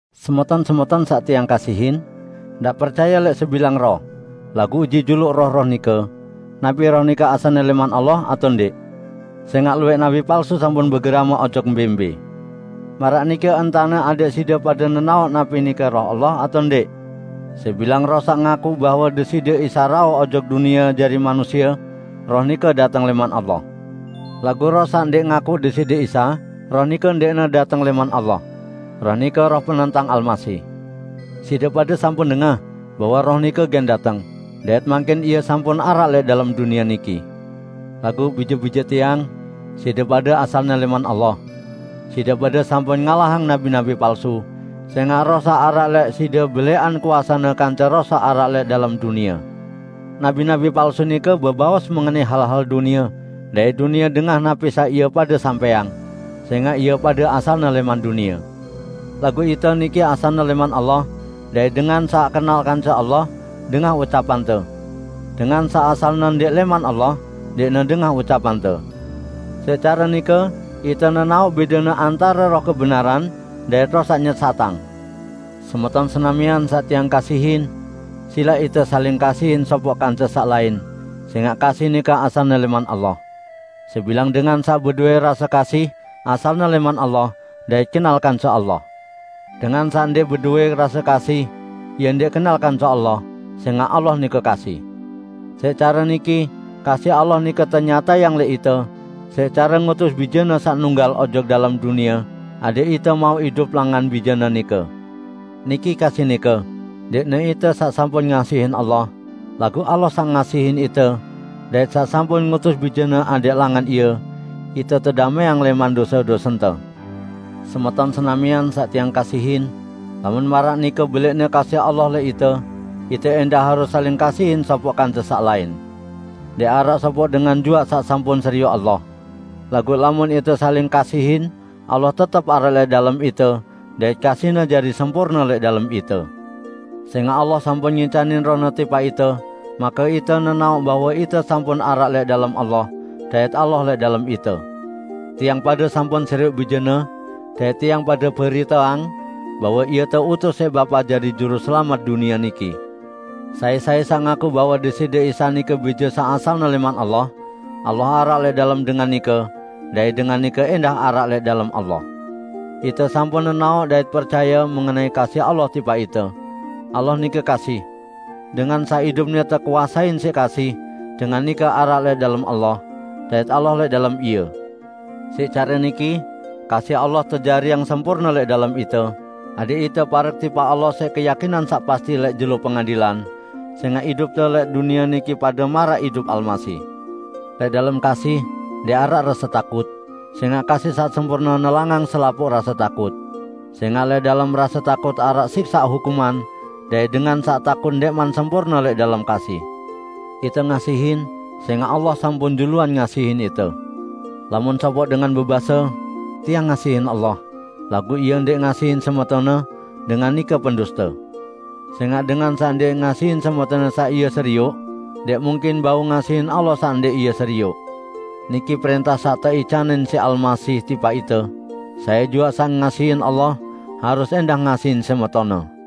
Semeton-semeton saq tiang kasihin! Ndaq percaye lẽq sebilang roh, laguq uji juluq roh-roh nike, napi roh nike asalne lẽman Allah atao ndẽq. Sẽngaq luwẽq nabi palsu sampun begerame ojok mbẽ-mbẽ. Maraq niki entane adẽq side pade nenaoq napi nike Roh Allah atao ndẽq: Sebilang roh saq ngaku bahwe Deside Isa rauh ojok dunie jari manusie, roh nike dateng lẽman Allah. Laguq roh saq ndẽq ngakuq Deside Isa, roh nike ndẽqne dateng lẽman Allah. Roh nike roh penentang Almasih. Side pade sampun dengah bahwe roh nike gen dateng, dait mangkin ie sampun araq lẽq dalem dunie niki. Laguq bije-bije tiang, side pade asalne lẽman Allah. Side pade sampun ngalahang nabi-nabi palsu, sẽngaq Roh saq araq lẽq side belẽqan kuasene kance roh saq araq lẽq dalem dunie. Nabi-nabi palsu nike bebaos mengenai hal-hal dunie, dait dunie dengah napi saq ie pade sampẽang, sẽngaq ie pade asalne lẽman dunie. Laguq ite niki asalne lẽman Allah; dait dengan saq kenal kance Allah, dengah ucapante. Dengan saq asalne ndẽq lẽman Allah, ndẽqne dengah ucapante. Siq care nike ite nenaoq bẽdene antare Roh kebenaran dait roh saq nyesatang. Semeton senamian saq tiang kasihin! Silaq ite saling kasihin sopoq kance saq lain, sẽngaq kasih nike asalne lẽman Allah. Sebilang dengan saq bedowẽ rase kasih, asalne lẽman Allah dait kenal kance Allah. Dengan saq ndẽq bedowẽ rase kasih, ie ndẽq kenal kance Allah; sẽngaq Allah nike kasih. Siq care niki kasih Allah nike tenyatayang lẽq ite, siq care ngutus Bije-Ne saq nunggal ojok dalem dunie adẽq ite mauq idup langan Bije-Ne nike. Niki kasih nike: Ndẽqne ite saq sampun ngasihin Allah, laguq Allah saq ngasihin ite dait saq sampun ngutus Bije-Ne adẽq langan Ie, ite tedamẽang lẽman dose-dosente. Semeton senamian saq tiang kasihin, lamun maraq nike belẽqne kasih Allah lẽq ite, ite ẽndah harus saling kasihin sopoq kance saq lain. Ndẽq araq sopoq dengan juaq saq sampun serioq Allah. Laguq lamun ite saling kasihin, Allah tetep araq lẽq dalem ite dait kasih-Ne jari sempurne lẽq dalem ite. Sẽngaq Allah sampun ngicanin Roh-Ne tipaq ite, make ite nenaoq bahwe ite sampun araq lẽq dalem Allah, dait Allah lẽq dalem ite. Tiang pade sampun serioq Bije-Ne, dait tiang pade beriteang bahwe Ie teutus siq Bapa jari Juruselamet dunie niki. Sai-sai saq ngaku bahwe Deside Isa nike Bije saq asalne lẽman Allah, Allah araq lẽq dalem dengan nike, dait dengan nike ẽndah araq lẽq dalem Allah. Ite sampun nenaoq dait percaye mengenai kasih Allah tipaq ite. Allah nike kasih. Dengan saq idupne tekuasein siq kasih, dengan nike araq lẽq dalem Allah, dait Allah lẽq dalem ie. Siq care niki kasih Allah tejariang sempurne lẽq dalem ite, adẽq ite parek tipaq Allah siq keyakinan saq pasti lẽq Jelo Pengadilan, sẽngaq idupte lẽq dunie niki pade maraq idup Almasih. Lẽq dalem kasih, ndẽq araq rase takut, sẽngaq kasih saq sempurne nelangang selapuq rase takut. Sẽngaq lẽq dalem rase takut araq siksaq hukuman dait dengan saq takut ndẽqman sempurne lẽq dalem kasih. Ite ngasihin, sẽngaq Allah sampun juluan ngasihin ite. Lamun sopoq dengan bebase, "Tiang ngasihin Allah," laguq ie ndẽq ngasihin semetonne, dengan nike penduste. Sẽngaq dengan saq ndẽq ngasihin semetonne saq ie serioq, ndẽq mungkin bau ngasihin Allah saq ndẽq ie serioq. Niki prẽntah saq teicanin siq Almasih tipaq ite: Sai juaq saq ngasihin Allah harus ẽndah ngasihin semetonne.